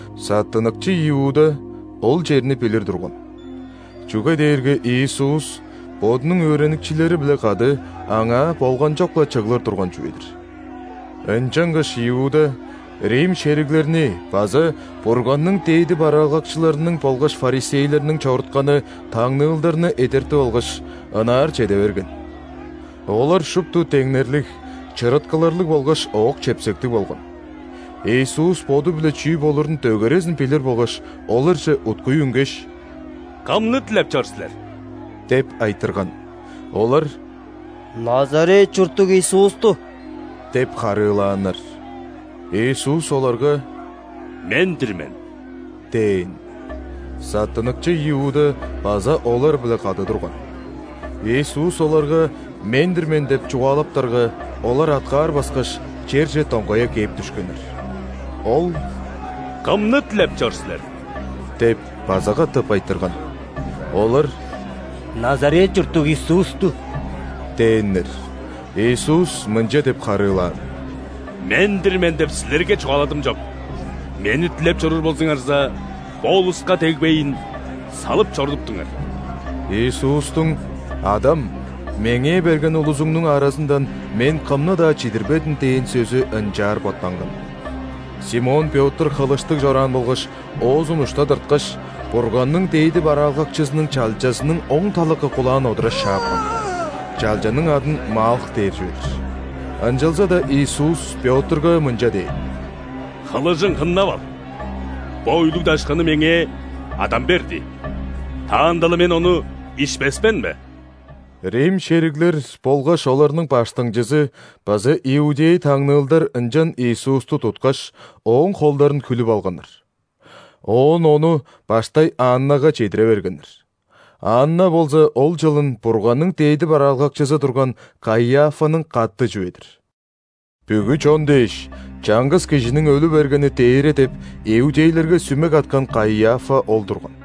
Саттыныкчы Иуда ол черни билир турган, чүге дээрге Иисус Бодунуң өөреникчилери-биле кады аңаа болганчок-ла чыглыр турган чүве-дир. Ынчангаш Иуда рим шериглерни база Бурганның дээди бараалгакчыларының болгаш ·фарисейлерниң чорутканы таңныылдарны эдертип алгаш, ынаар чеде берген. Олар шупту деңнерлиг, чырыткыларлыг болгаш ок-чепсектиг болган. Иисус Боду-биле чүү болурун дөгерезин билир болгаш, оларже уткуй үнгеш: «Кымны дилеп чор силер?» – деп айтырган. Олар: «Назарет чурттуг Иисусту» – деп харыылааннар. Иисус оларга: «Мен-дир мен» – дээн. Саттыныкчы Иуда база олар-биле кады турган. Иисус оларга: «Мен-дир мен» – деп чугаалаптарга, олар аткаар баскаш, черже доңгая кээп дүшкеннер. Ол: «Кымны дилеп чор силер?» – деп база катап айтырган. Олар: «Назарет чурттуг Иисусту» – дээннер. Иисус мынча деп харыылаан: «„Мен-дир мен“ деп силерге чугааладым чоп. Мени дилеп чоруур болзуңарза, бо улуска дегбейн, салып чорудуптуңар». (Иисустуң: «Адам, Меңээ берген улузуңнуң аразындан Мен кымны-даа чидирбедим» – дээн сөзү ынчаар боттанган.) Симон Пётр хылыштыг чораан болгаш, оозун ушта тырткаш, Бурганның дээди бараалгакчызының чалчазының оң талакы кулаан одура шаапкан. Чалчаның адын Малх дээр чүве-дир. Ынчалза-даа Иисус Пётрга мынча дээн: «Хылыжың хыннап ал! Бо үлүг-дашканы Меңээ Адам берди. Таанда-ла Мен ону ишпес мен бе?» Рим шериглер болгаш оларның баштыңчызы база иудей таңныылдар ынчан Иисусту туткаш, Ооң холдарын хүлүп алганнар. Оон Ону баштай Аннага чедире бергеннер. Анна болза ол чылын Бурганның дээди бараалгакчызы турган Каиафаның каты чүве-дир. «Бүгү чон дээш, чаңгыс кижиниң өлү бергени дээре» деп, иудейлерге сүме каткан Каиафа ол турган.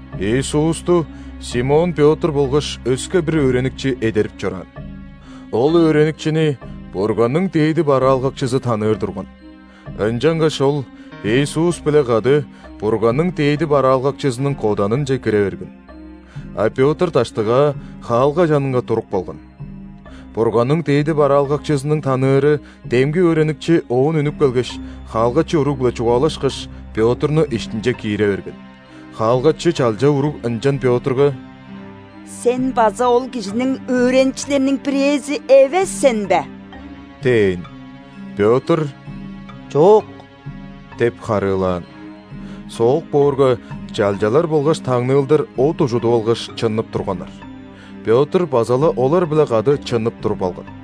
Иисусту Симон Пётр болгаш өске бир өөреникчи эдерип чораан. Ол өөреникчини Бурганның дээди бараалгакчызы таныыр турган, ынчангаш ол Иисус-биле кады Бурганның дээди бараалгакчызының коданынче кире берген. А Пётр даштыгаа, хаалга чанынга туруп калган. Бурганның дээди бараалгакчызының таныыры демги өөреникчи оон үнүп келгеш, хаалгачы уруг-биле чугаалашкаш, Пётрну иштинче киире берген. Хаалгачы чалча уруг ынчан Пётрга: «Сен база ол Кижиниң өөреникчилериниң бирээзи эвес сен бе?» – дээн. Пётр: «Чок» – деп харыылаан. Соок боорга, чалчалар болгаш таңныылдар от ужудуп алгаш, чыннып турганнар. Пётр база-ла олар-биле кады чыннып туруп алган.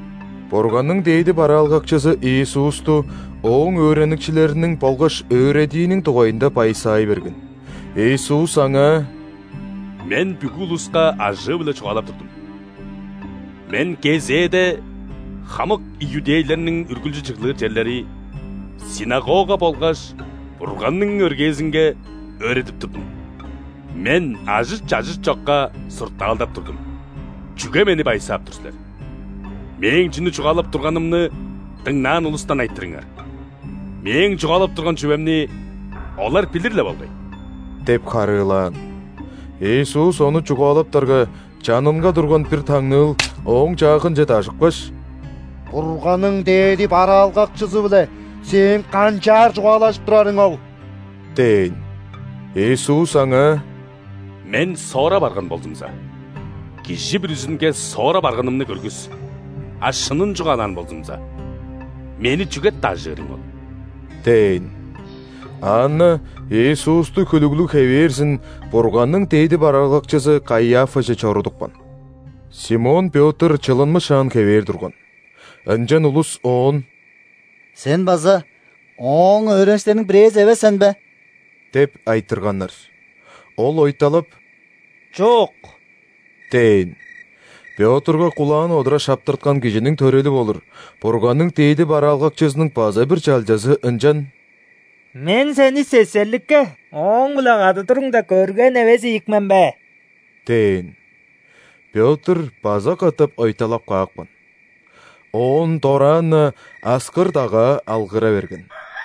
Бурганның дээди бараалгакчызы Иисусту Ооң өөреникчилериниң болгаш өөредииниң дугайында байысаай берген. Иисус аңаа: «Мен бүгү улуска ажыы-биле чугаалап турдум. Мен кезээде хамык иудейлерниң үргүлчү чыглыр черлери – ·синагога болгаш Бурганның өргээзинге өөредип турдум. Мен ажыт-чажыт чокка суртаалдап турдум. Чүге Мени байысаап тур силер? Мээң чүнү чугаалап турганымны дыңнаан улустан айтырыңар. Мээң чугаалап турган чүвемни олар билир-ле болгай» – деп харыылаан. Иисус ону чугаалаптарга, чанынга турган бир таңныыл Ооң чаагынче дажыпкаш: «Бурганның дээди бараалгакчызы-биле Сээң канчаар чугаалажып турарың ол?» – дээн. Иисус аңаа: «Мен соора барган болзумза, кижи бүрүзүнге соора барганымны көргүс, а шынын чугаалаан болзумза, Мени чүге дажыырың ол?» – дээн. Анна Иисусту хүлүглүг хевээрзин Бурганның дээди бараалгакчызы Каиафаже чорудупкан. Симон Пётр чылынмышаан хевээр турган. Ынчан улус оон: «Сен база Ооң өөреникчилериниң бирээзи эвес сен бе?» – деп айтырганнар. Ол ойталап: «Чок» – дээн. Пётрга кулаан одура шаптырткан кижиниң төрели болур, Бурганның дээди бараалгакчызының база бир чалчазы ынчан: «Мен сени сесерликке, Ооң-биле кады туруңда көрген эвес ийик мен бе?» – дээн. Пётр база катап ойталап каапкан. Оон дораан-на аскыр-дагаа алгыра берген.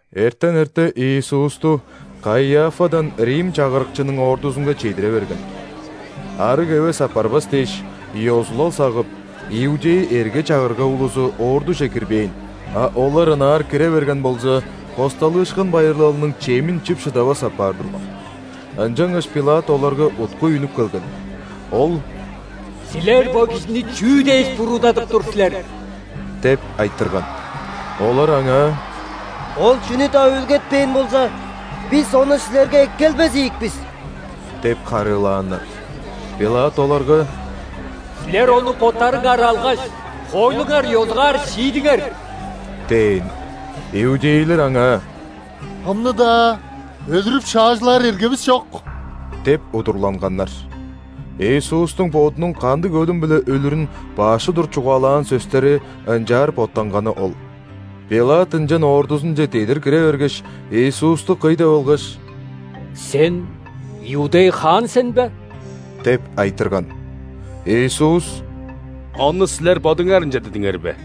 Эртен эрте Иисусту Каиафадан рим чагырыкчының ордузунга чедире бергеннер. Арыг эвес апарбас дээш, ёзулал сагып, иудей эрге-чагырга улузу ордуже кирбээн, а олар ынаар кире берген болза, ·Хосталыышкын байырлалының чемин чип шыдавас апаар турган. Ынчангаш ·Пилат оларга уткуй үнүп келген. Ол: «Силер Бо кижини чүү дээш буруудадып тур силер?» – деп айтырган. Олар аңаа: «Ол чүнү-даа үүлгетпээн болза, бис Ону силерге эккелбес ийик бис» – деп харыылааннар. Пилат оларга: «Силер Ону боттарыңар алгаш, хоойлуңар ёзугаар шиидиңер» – дээн. Иудейлер аңаа: «Кымны-даа өлүрүп шаажылаар эргевис чок» – деп удурланганнар. (Иисустуң Бодунуң кандыг өлүм-биле өлүрүн баш удур чугаалаан сөстери ынчаар боттанганы ол). Пилат ынчан ордузунче дедир кире бергеш, Иисусту кый деп алгаш: «Сен иудей хаан сен бе?» – деп айтырган. Иисус: «Ону силер бодуңар ынча дидиңер бе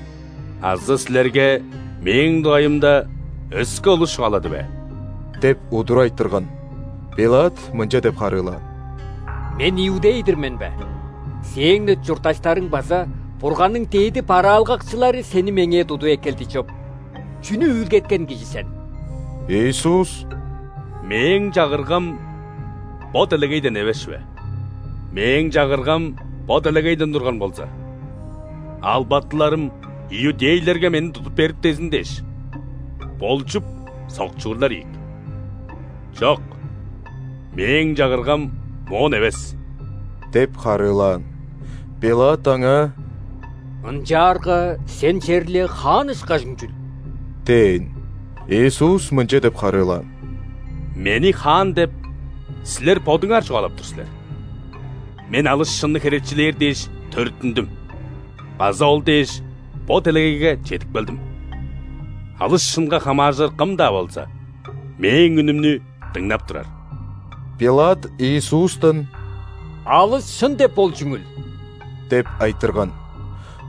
азы силерге Мээң дугайымда өске улус чугаалады бе?» – деп удур айтырган. Пилат мынча деп харыылаан: «Мен иудей-дир мен бе? Сээң-не чуртташтарың база Бурганның дээди бараалгакчылары Сени меңээ тудуп эккелди чоп. Чүнү үүлгеткен кижи сен?» Иисус: «Мээң Чагыргам бо делегейден эвес чүве. Мээң Чагыргам бо делегейден турган болза, албатыларым иудейлерге Мени тудуп бериптезин дээш болчуп, сокчурлар ийик. Чок, Мээң Чагыргам моон эвес» – деп харыылаан. Пилат Аңаа: «Ынчаарга Сен черле хаан ышкажың чүл?» – дээн. Иисус мынча деп харыылаан: «Мени хаан деп, силер бодуңар чугаалап тур силер. Мен алыс шынны херечилээр дээш төрүттүндүм база ол дээш, бо делегейге чедип келдим. Алыс шынга хамааржыр кым-даа болза, Мээң үнүмнү дыңнап турар». Пилат Иисустан: «Алыс шын деп ол чүңүл?» – деп айтырган.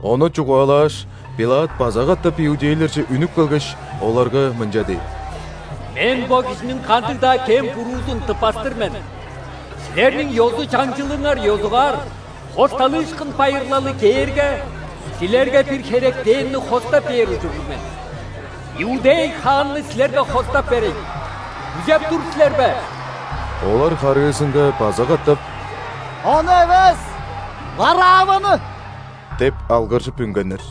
Ону чугаалааш, Пилат база катап иудейлерже үнүп келгеш, оларга мынча дээн: «Мен бо кижиниң кандыг-даа кем-буруузун тыппас-тыр мен. Силерниң ёзу-чаңчылыңар ёзугаар, ·Хосталыышкын байырлалы кээрге, силерге бир херектенни хостап бээр ужурлуг мен. „Иудей хаанны“ силерге хостап берейн, күзеп тур силер бе?» Олар харыызынга база катап: «Ону эвес! Варавваны!» – деп алгыржып үнгеннер.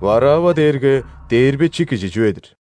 Варавва дээрге дээрбечи кижи чүве-дир.